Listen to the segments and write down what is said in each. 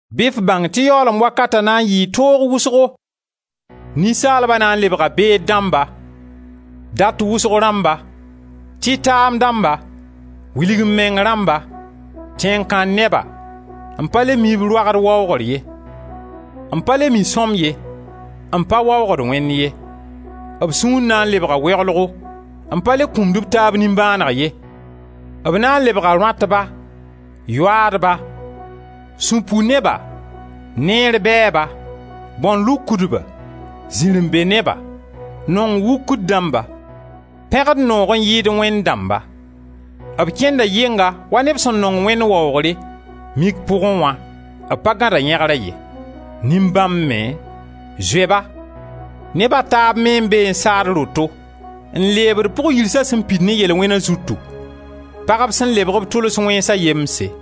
Bɩ f bãng tɩ yaoolem wakata na n yɩɩ toogo wʋsgo. Ninsaalba na n lebga beed dãmba, dat wʋsg rãmba, tɩtaam dãmba, wilg-m-meng rãmba, tẽn-kãn-neba, n pa le mi b roagd waoogr ye, n pa le mi sõm ye, n pa waoogd Wẽnd ye. B sũur na n lebga weoglgo, n pa le kũmd b taab nimbãaneg ye, b na n lebga rõatba, yoaadba, sũ-pu-neba, neer bɛɛba, bãon-lukdba, zirẽ-be-neba, nong-wukr-dãmba, pẽgd noogo n yɩɩd Wẽnd dãmba. B kẽnda yɩnga wa neb sẽn nong Wẽnd waoogre, mik pʋgẽ wã b pa gãd a yẽgra ye. Nin-bãmb me, zoe-ba! Neb a taab me n be n saad roto n lebd pʋg-yirsa sẽn pid ne yel-wẽna zutu, pagb sẽn lebg b tʋls wẽnsa yemse;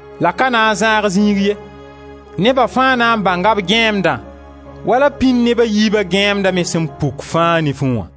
La ka na n zãag ziig ye; neba fãa na n bãnga b gãeemdã wala pĩnd neb a yiiba gãeemda me sẽn puk fãa nifẽ wã.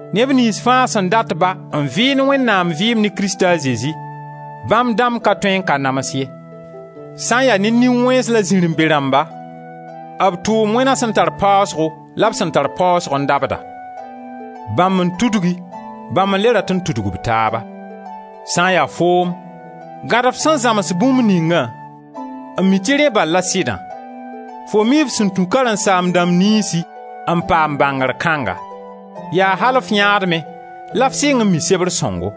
Neb niyns fãa sẽn dat-ba n vɩɩnd Wẽnnaam vɩɩm ne Krista a Zezi, bãmb dãmb ka tõe n ka nams ye. Sã n ya ne nin-wẽns la zirẽ-be-rãmba, b tʋʋm-wẽna sẽn tar paasgo la b sẽn tar paasgo n dabda; bãmb n tudgi, bãmb n le rat n tudg b taaba. Sã n ya foom, gãd f sẽn zãms bũmb ningã, n mi tɩ rẽ bal la sɩdã. Fo mii f sẽn tũ karen-saam-dãmb niynsi n paam bãngr kãnga. Yaa al f yãadmẽ la f sɩng n mi sebr sõngo;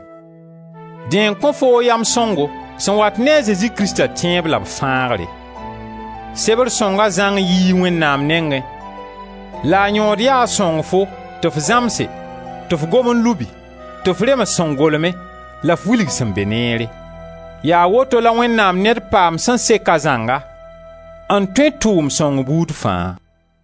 dẽ n kõ foo yam sõngo sẽn wat ne a Zezi Krista tẽeb la f fãagre. Sebr sõnga zãng yii Wẽnnaam nengẽ la a yõod ya a sõng fo tɩ f zãmse, tɩ f gom n lubi, tɩ f rems sẽn golme la f wilg sẽn be neere. Yaa woto la Wẽnnaam ned paamd sẽn sek a zãnga n tõe tʋʋmd sõng buud fãa.